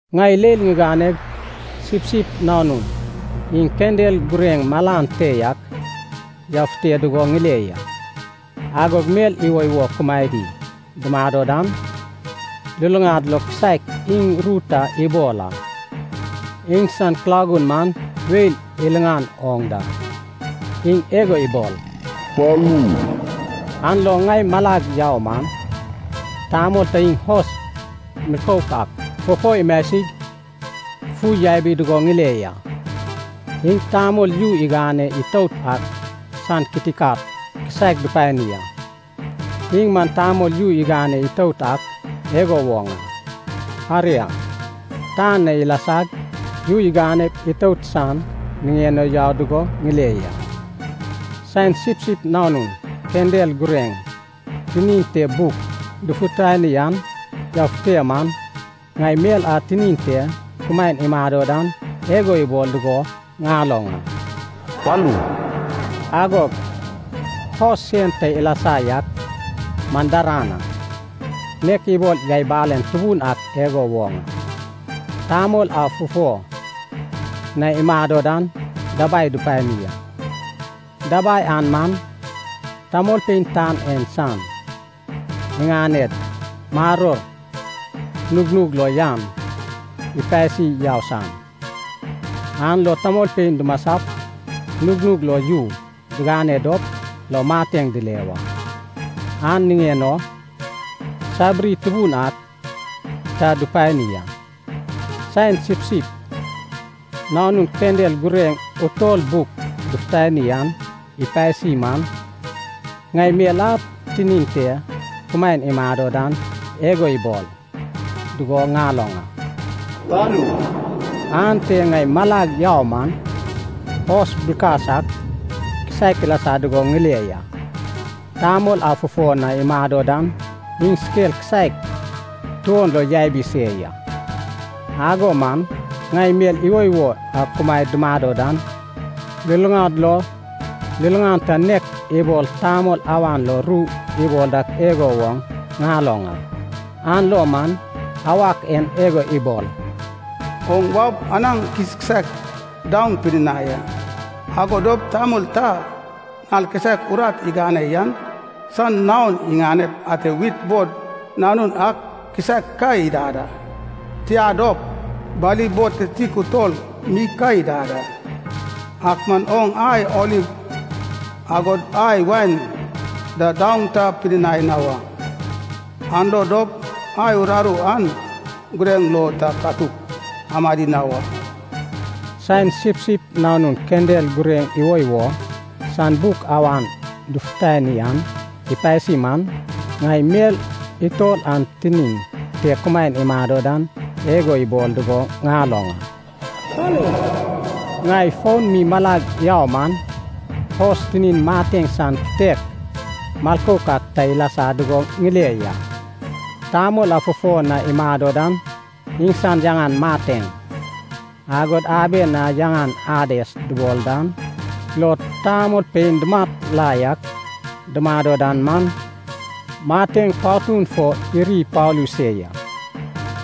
Ŋai leil ŋiganeg Sipsip Nanun iŋ kendel gureŋ malan te yak yafute dugo ŋile ya. Agog mel iwoiwo kumaedi dumado dan, luluŋad lo kisaek iŋ ru ta ibol a. Iŋsan kulagun man weil iliŋan oŋ da, iŋ igo ibol, “Palu!” An lo ŋai malag yau man, tamol ta iŋ hos milkouk ak fufo imasig fui yabi dugo ŋile ya. Iŋ tamol yu iganeg itout ak san kitikat kisaek dupani a. Iŋ man tamol yu igane itout ak igo woŋ a, aria, tan na ilasag yu iganep itout san niŋen o yau dugo ŋile ya. Saen Sipsip Nanun kendel gureŋ tinin te buk dufutani an yafute man, ŋai mel a tinin te kumaen imado dan igo ibol dugo ŋaloŋ a, “Palu!” Agog hos sen ta ilasa yak man daran a, nek ibol yai balen tubun ak igo woŋ a. Tamol a fufo na imado dan dabai dupani a. Dabai an man, tamolpein tan en san iŋaned maror nugnug lo yan ipasi yau san, an lo tamolpein dumasap nugnug lo yu digane dop lo mateŋ dile wa. An niŋen o sabiri tubun ak ta dupani a. Saen Sipsip Nanun kendel gureŋ utol buk dufutani an ipasi man, ŋai mel a tinin te kumaen imado dan igo ibol, dugo ŋaloŋ a, “Palu!” Ante ŋai malag yau man, hos bilkas ak kisaek ilasa dugo ŋile ya. Tamol a fufo na imado dan iŋ skel kisaek tuon lo yabi se ya. Ago man ŋai mel iwoiwo a kumaed dumado dan, luluŋad lo liliŋan ta nek ibol tamol awan lo ru ibol dak igo woŋ ŋaloŋ a. An lo man awak en igo ibol, “Oŋ waup anaŋ kiskisaek daoŋ pidinai a. Ago dop tamol ta nal kisaek urat igane yan san naon iŋanep ate wit bod nanun ak kisaek ka idad a, tia dop, bali bod kititik utol mi ka idad a. Ak man oŋ ai oliv agod ai wain da daoŋ ta pidinai na wa, an lo dop ai uraru an gureŋ lo ta katuk amadi na wa.” Saen Sipsip Nanun kendel gureŋ iwoiwo san buk awan dufutani an ipasi man, ŋai mel utol an tinin te kumaen imado dan igo ibol dugo ŋaloŋ a, “Palu!” Ŋai foun mi malag yau man, hos tinin mateŋ san kitek milkouk ak ta ilasa dugo ŋile ya. Tamol a fufo na imado dan iŋsan yaŋan Mateŋ, agod aben a yaŋan Ades dubol dan lo tamolpein dumat la yak dumado dan man, Mateŋ patun fo iri ipalu se ya.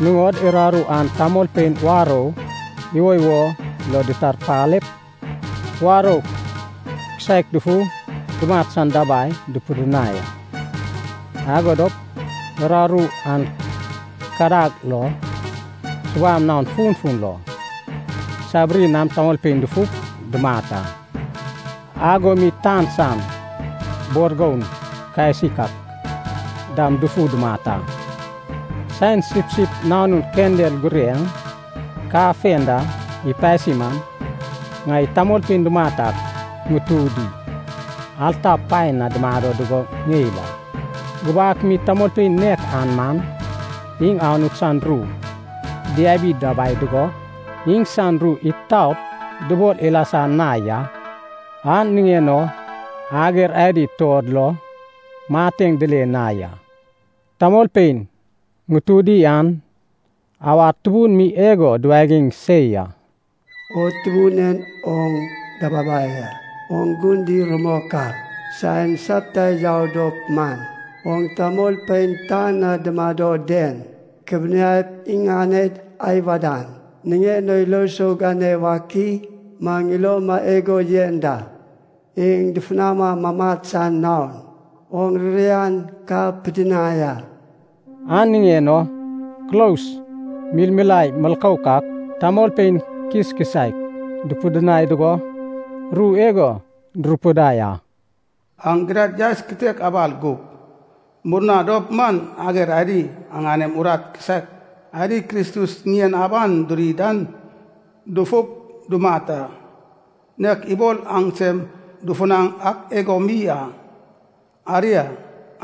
Nuŋod uraru an tamolpein warou iwoiwo lo ditarpalep, warou kisaek dufu dumat san dabai dupidinai a. Ago dop uraru an kadag lo, subam naon funfun lo, sabiri nam tamolpein dufup dumat a, ago mi tan san bor goun kasik ak dam dufu dumat a. Saen Sipsip Nanun kendel gureŋ kafenda ipasi man, ŋai tamolpein dumat ak ŋutudi alta paen na dumado dugo ŋeil a. Gubak mi tamolpein nek an man, iŋ Anut san ru diabi dabai dugo iŋsan ru itaot dubol ilasa na ya, an niŋen o ager adi tuod lo mateŋ dile na ya. Tamolpein ŋutudi an awad tubun mi igo duwagiŋ se ya, “O Tubun en, oŋ Dababai a, oŋ gun di rumok a. Saen sapta yau dop man, oŋ tamolpein tan na dumado den kubianaip iŋaned ai wadan niŋen o ilo sou gane wak i? Maŋ iloma igo yen da, iŋ dufunama mamat san naon oŋ ririan ka pidinai a.” An niŋen o kulos milmilae milkouk ak, tamolpein kiskisaek dupidinai dugo, ru igo durupidai a. “Aŋ gidad yaes kitek abal gup, murna dop man ager adi aŋanem urat kisaek adi Kristus ŋien aban duri dan dufup dumat a, nek ibol aŋsem dufunaŋ ak igo mi a. Aria,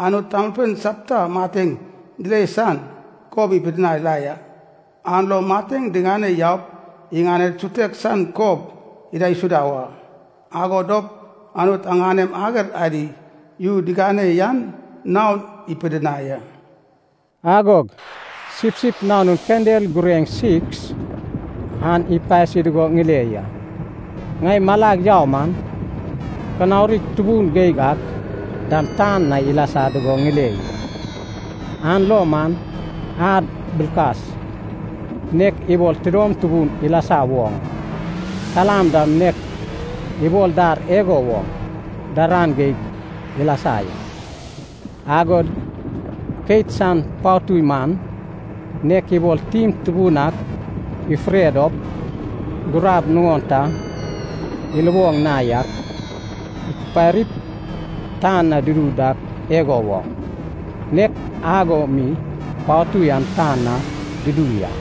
Anut tamolpein sapta mateŋ dile san kob ipidinai la ya. An lo mateŋ diŋane yaup iŋaned sutek san kob idaisuda wa, ago dop Anut aŋanem ager adi yu digane yan naon ipidinai a.” Agog Sipsip Nanun kendel gureŋ siks an ipasi dugo ŋile ya. Ŋai malag yau man, kanaurig tubun geig ak dam tan na ilasa dugo ŋile ya. An lo man ad bilkas, nek ibol tidom tubun ilasa woŋ a. Kalam dam nek ibol dar igo woŋ daran geig ilasa ya. Agod keit san patui man, nek ibol tim tubun ak ifure dop gurab nuŋon ta iluboŋ na yak ikuparip tan na dudu dak igo woŋ, nek ago mi patui an tan na dudu ya.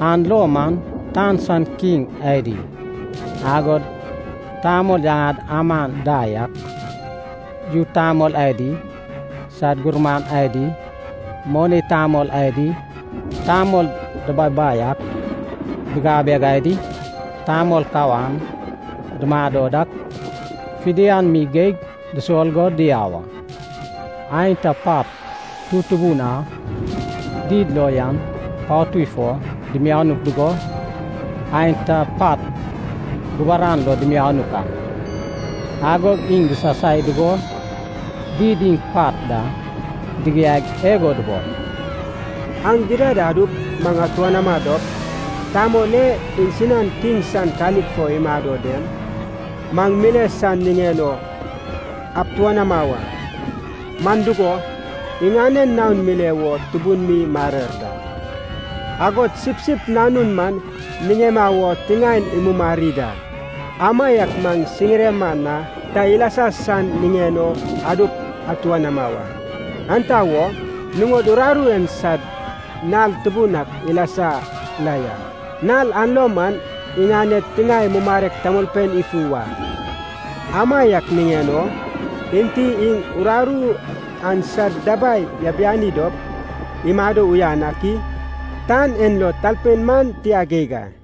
An lo man tan san kiŋ adi agod tamol yaŋad aman da yak, yu tamol adi sad gurman adi, moni tamol adi, tamol dababai ak, bigabeg adi, tamol kawan dumado dak, fidian mi geig dusol go diau a. Aenta pat tutubun a did lo yan patud fo dimianuk dugo, aenta pat guburan lo dimianuk a. Agog iŋ disasai dugo did iŋ pat da digiaig igo dubol, “Aŋ gidad adup maŋ atuanama dop, Tamol e iŋsinan kiŋ san kalik fo imado den, maŋ mile san niŋen o abtuanama wa, man dugo, iŋanen naon mile wo tubun mi marer da. Agod Sipsip Nanun maŋ niŋema wo tiŋaen imumari da, amaiak maŋ siŋirema na ta ilasa san niŋen o adup atuanama wa. Enta wo? Nuŋod uraru en sad nal tubun ak ilasa la ya, nal an lo man iŋaned tiŋae mumarek tamolpein ifu wa. Amaiak niŋen o enti iŋ uraru an sad dabai yabiani dop imado uyan ak i? Tan en lo talpein man tia geig a!”